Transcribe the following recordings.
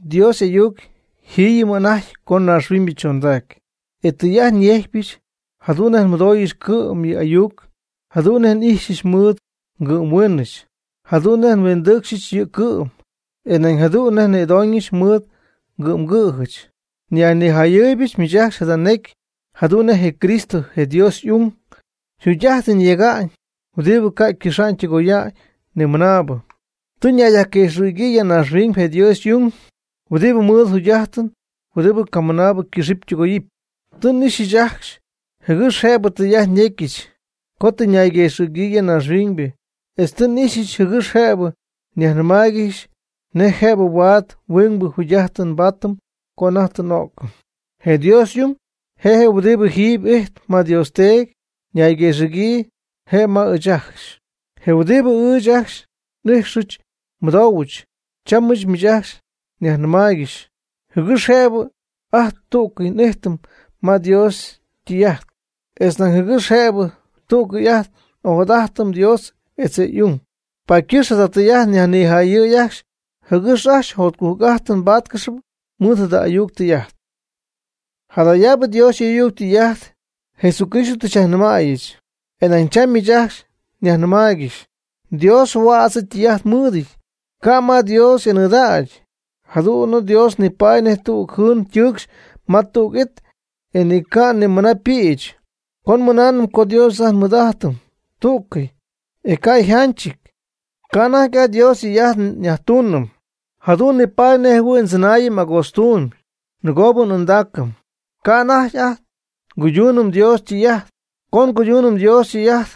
Dios y'ayuc jiiyɨm anajty co naaxhuiñybɨ chondacy. E tɨy'ajt nyejcypɨch jadu'n nej nmɨdooyɨch cɨ'm yɨ' y'ayuc, jadu'n nej n'ijxyɨch mɨɨd ngɨ'mhuiinɨch, jadu'n nej nhuindɨɨcxyɨch yɨ' cɨ'm, e nañ jadu'n nej nnïdoñɨch mɨɨd ngɨ'mgɨ̈jɨch. Nyajnijayɨɨybɨch miich ajcxy jada necy jadu'n nej je Cristo je Dios y'ung yjugy'ajtɨn yega'ñ huɨdibɨ ca' cɨxa'ñ tɨgoya'ñ nimɨnaabɨ. Tɨ ñayguëxɨ̈gyii ya naaxhuiñ je Dios y'ung huɨdibɨ ymɨɨd jugy'ajtɨn huɨdibɨ ca' nimɨnaabɨ ycɨxɨpy ytɨgoyɨpy. Tɨ n'ixyɨch ajcxy jɨgɨx jëbɨ tɨy'ajt nyéjccɨxyɨch co tɨ ñayguëxɨ̈gyii ya naaxhuiñ, etz tɨ n'ixyɨch jɨgɨx jëbɨ nyajnɨmaaygɨxy nej jëbɨ huaad huingbɨ jugy'ajtɨn nbaatɨm co anajty tɨ n'o'cɨm. Je Dios y'ung, je huɨdibɨ jiiby ijtp ma Dios Teedy, nayguëxɨ̈cɨ je' ma ɨɨch ajcxy. Je huɨdibɨ ɨɨch ajcxy n'ijxɨch nmɨdohuɨch, cham miich ajcxy nyajnɨmaaygɨxy jɨgɨx jëbɨ ajt tú'cɨy n'ijtɨm ma Dios ytɨy'ajt, etz nañ jɨgɨx jëbɨ tú'cɨy ajt n'ojadajtɨm Dios etz je' y'ung. Paady ycɨxp jada tɨy'ajt nyajnijäyɨ̈y ajcxy jɨgɨx ajcxy jotcujc'ajtɨn mbattáaygɨxɨpy mɨɨd jada ayuc tɨy'ajt. Jadayaabɨ Dios y'ayuc ytɨy'ajt Jesucristo tɨ xyajnɨmäyɨch e nañ cham ɨɨch miich ajcxy nyajnɨmaaygɨxy. Dios huädz ytɨy'ajt mɨɨdɨty, ca' ma Dios anɨɨdägy. Jadu'n Dios nipaady nej tüg jɨɨn ytɨɨcxy ma tüg it e ni ca' ni mɨna ypïch. Co nmɨnaanɨm co Dios ajt mɨɨd n'ijtɨm tú'cɨy, e ca' yjanchɨty, ca' anajty ajt Dios ytɨy'ajt nyajtuunɨm, jadu'n nipaady nej jɨhuɨ̈y ndzɨnaayɨm agootztuum. Nɨgoo n'ɨɨndaacɨm, ca' anajty ajt nguyduunɨm Dios ytɨy'ajt. Co nguyduunɨm Dios ytɨy'ajt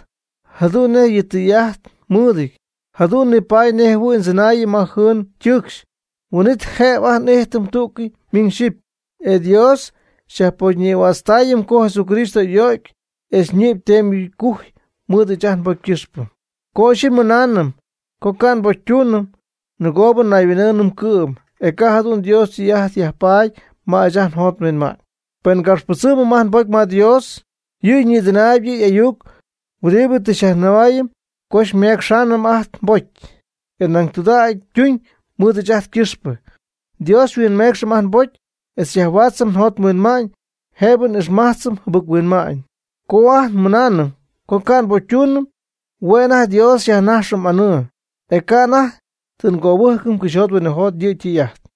jadu'n nej yɨ' ytɨy'ajt mɨɨdɨty, jadu'n nipaty nej jɨhuɨ̈y ndzɨnaayɨm ma jɨɨn ytɨɨcxy. Huin'it jëbɨ ajt n'ijtɨm tú'cɨy miñ xyɨpy, e Dios xyajpocynïhuaatztaayɨm co Jesucristo y'o'cy etz ñɨ'py teemy gujy mɨɨd ɨɨch ajt nbocy ycɨxpɨ. Co ixyipy nmɨnaanɨm co ca' nbocytuunɨm, nɨgoob nayhuin'ɨɨnɨm cɨ'm, e ca' jadu'n Dios ytɨy'ajt yajpaady ma ɨɨch ajt njot nhuinma'ñ. Pen ngapxypɨdzɨmɨm ajt nbocy ma Dios, yɨ' ñïdɨnaayb yɨ' y'ayuc huɨdibɨ tɨ xyajnɨmaayɨm co ymecxamy ajt nbocy, e nañ tudägy ytuñ mɨɨd ɨɨch ajt ycɨxpɨ. Dios xyhuinmeecxɨm ajt nbocy etz xyajhuaatzɨm njot nhuinma'ñ jëbɨ n'ixmajtzɨm jɨbɨc-huinma'ñ. Co ajt nmɨnaanɨm co ca' nbocytuunɨm, hue' anajty Dios nyajnajxɨm anɨɨ, e ca' anajty tɨ ngöbɨjcɨm cɨxyjot huinɨjot yɨ' ytɨy'ajt.